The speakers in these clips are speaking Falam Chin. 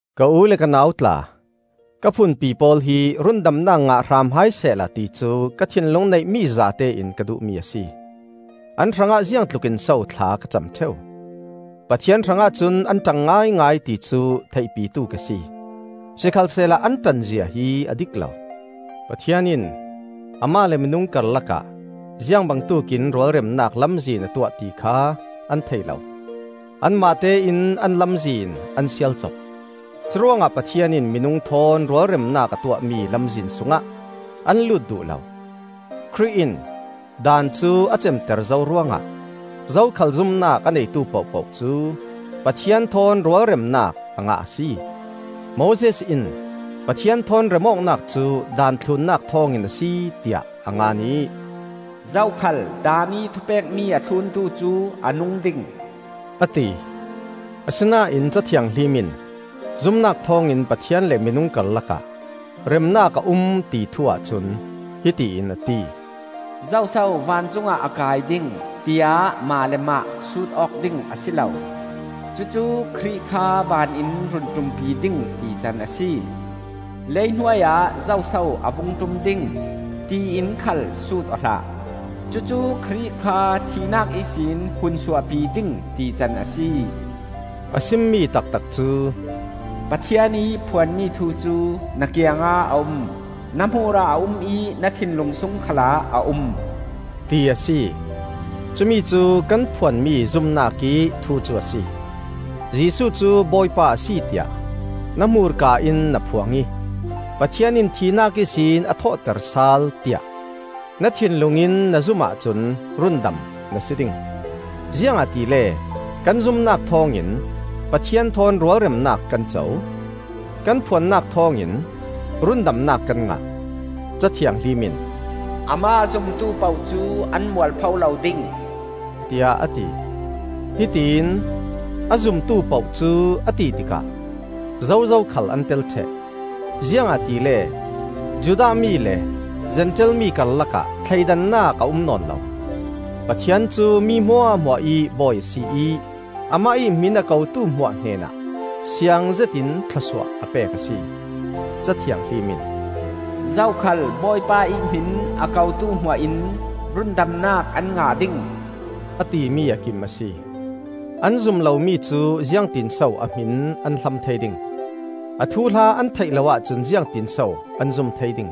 Ka u le ka nau tla, ka phunpi pawl hi rundamnak ngah hram hai sehla ti cu ka thinlung neihmi zatein ka duhmi a si. An hrangah ziangtlukin so thla ka cam ṭheu! Pathian hrangah cun an ṭang ngaingai, ti cu theihpitu ka si; sikhalsehla an ṭanzia hi a dik lo. Pathian in amah le minung karlakah ziang bangtuk in rualremnak lamzin a tuah ti kha an thei lo; anmahte in an lamzin an sialcop. curuangah Pathian in minung thawn rualremnak a tuahmi lamzin sungah an lut duh lo. Khrih in Daan cu a cemter zo ruangah zo khal zumnak a neitu pohpoh cu Pathian thawn rualremnak a ngah a si. Moses in Pathian thawn rem awknak cu Daan thlunnak thawngin a si, tiah a ngan ih, “Zokhal Daan ih thupekmi a thluntu cu a nung ding,” a ti. Asinain Ca Thianghlim in zumnak thawngin Pathian le minung karlakah remnak a um, ti thu-ah cun hiti in a ti: “Zoso vancungah a kai ding? tiah mah le mah sut awk ding a si lo.” (Cucu Khrih kha van in run ṭumpi ding, tican a si.) “Lei hnuai ah zoso a vung ṭum ding? tiin khal sut aw hlah.” (Cucu Khrih kha thihnak ihsin hun suahpi ding, tican a si.) A simmi taktak cu, “Pathian ih phuanmi thu cu na kiangah a um, na hmur ah a um ih na thinlung sung khalah a um,” ti a si. Cumi cu kan phuanmi zumnak ih thu cu a si. Jesuh cu Bawipa a si tiah na hmurka in na phuang ih Pathian in thihnak ihsin a thawhter sal, tiah na thinlung in na zum ahcun rundam na si ding. Ziangahtile kan zumnak thawngin Pathian thawn rualremnak kan co; kan phuannak thawngin rundamnak kan ngah. Ca Thianghlim in, “Amah a zumtu poh cu an mualpho lo ding,” tiah a ti. Hitión ‘A zumtu poh cu,’ a ti tikah zozo khal an tel ṭheh, ziangahtile Judah mi le Zentail mi karlakah thleidannak a um nawn lo. Pathian cu mi hmuahhmuah ih Bawi a si ih Amah ih hmin a kotu hmuah hnenah siang zetin thlawsuah a pek a si. Ca Thianghlim in, “Zokhal Bawipa ih hmin a kotu hmuah in rundamnak an ngah ding,” a timi a kim a si. An zum lomi cu ziangtinso a hmin an hlam thei ding? A thuhla an theih lo ahcun ziangtinso an zum thei ding?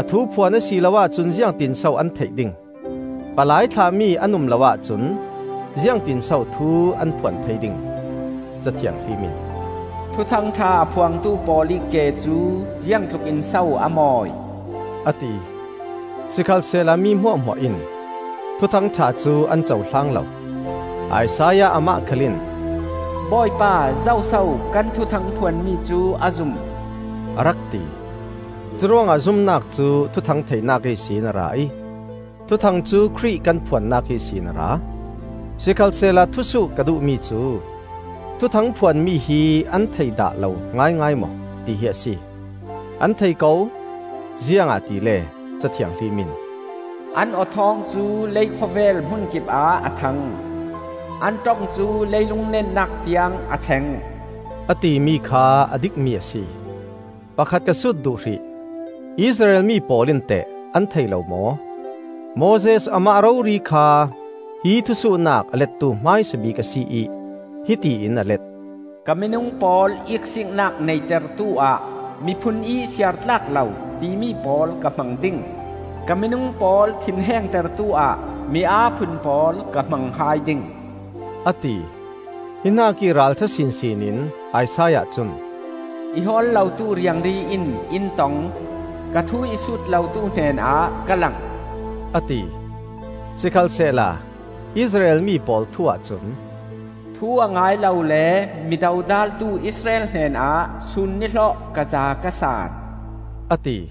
A thu phuan a si lo ahcun ziangtinso an theih ding? Palai thlahmi an um lo ahcun ziangtinso thu an phuan thei ding? Ca Thianghlim in, “Thuthang ṭha a phuangtu pawl ih ke cu ziang tlukin so a mawi!” a ti. Sikhalsehla mi hmuahhmuah in Thuthang ṭha cu an cohlang lo. Isaiah amah khal in, “Bawipa, zoso kan thuthang phuanmi cu a zum?” a rak ti. Curuangah zumnak cu thuthang theihnak ihsin a ra ih thuthang cu Khrih kan phuannak ihsin a ra. Sikhalsehla thusuh ka duhmi cu: “Thuthang phuan mi hi an thei dah lo ngaingai maw?” ti hi a si. An thei ko; ziangahtile Ca Thianghlim in: “An aw thawng cu leikhawvel hmunkip ah a thang; An ṭong cu leilung netnak tiang a thleng,” a timi kha a dikmi a si. Pakhat ka sut duh hrih: “Israel mi pawl in teh an thei lo maw?” Moses amah rori kha hi thusuhnak a lettu hmaisa bik a si ih hiti in a let. “Ka minung pawl iksiiknak neitertu ah, ‘Miphun ih siar tlak lo,’ timi pawl ka hmang ding. Ka minung pawl thinhengtertu ah, mi aa phun pawl ka hmang hai ding,” a ti. Hi hnakih ralṭha sinsin in Isaiah cun, “I hawl lotu riangri in in tong, Ka thu i sut lotu hnenah ka lang,” a ti. Sikhalsehla Israel mi pawl thu-ah cun: “Thu a ngai lo le mi dodaltu Israel hnenah sun nihlawh ka zaa ka saan,” a ti.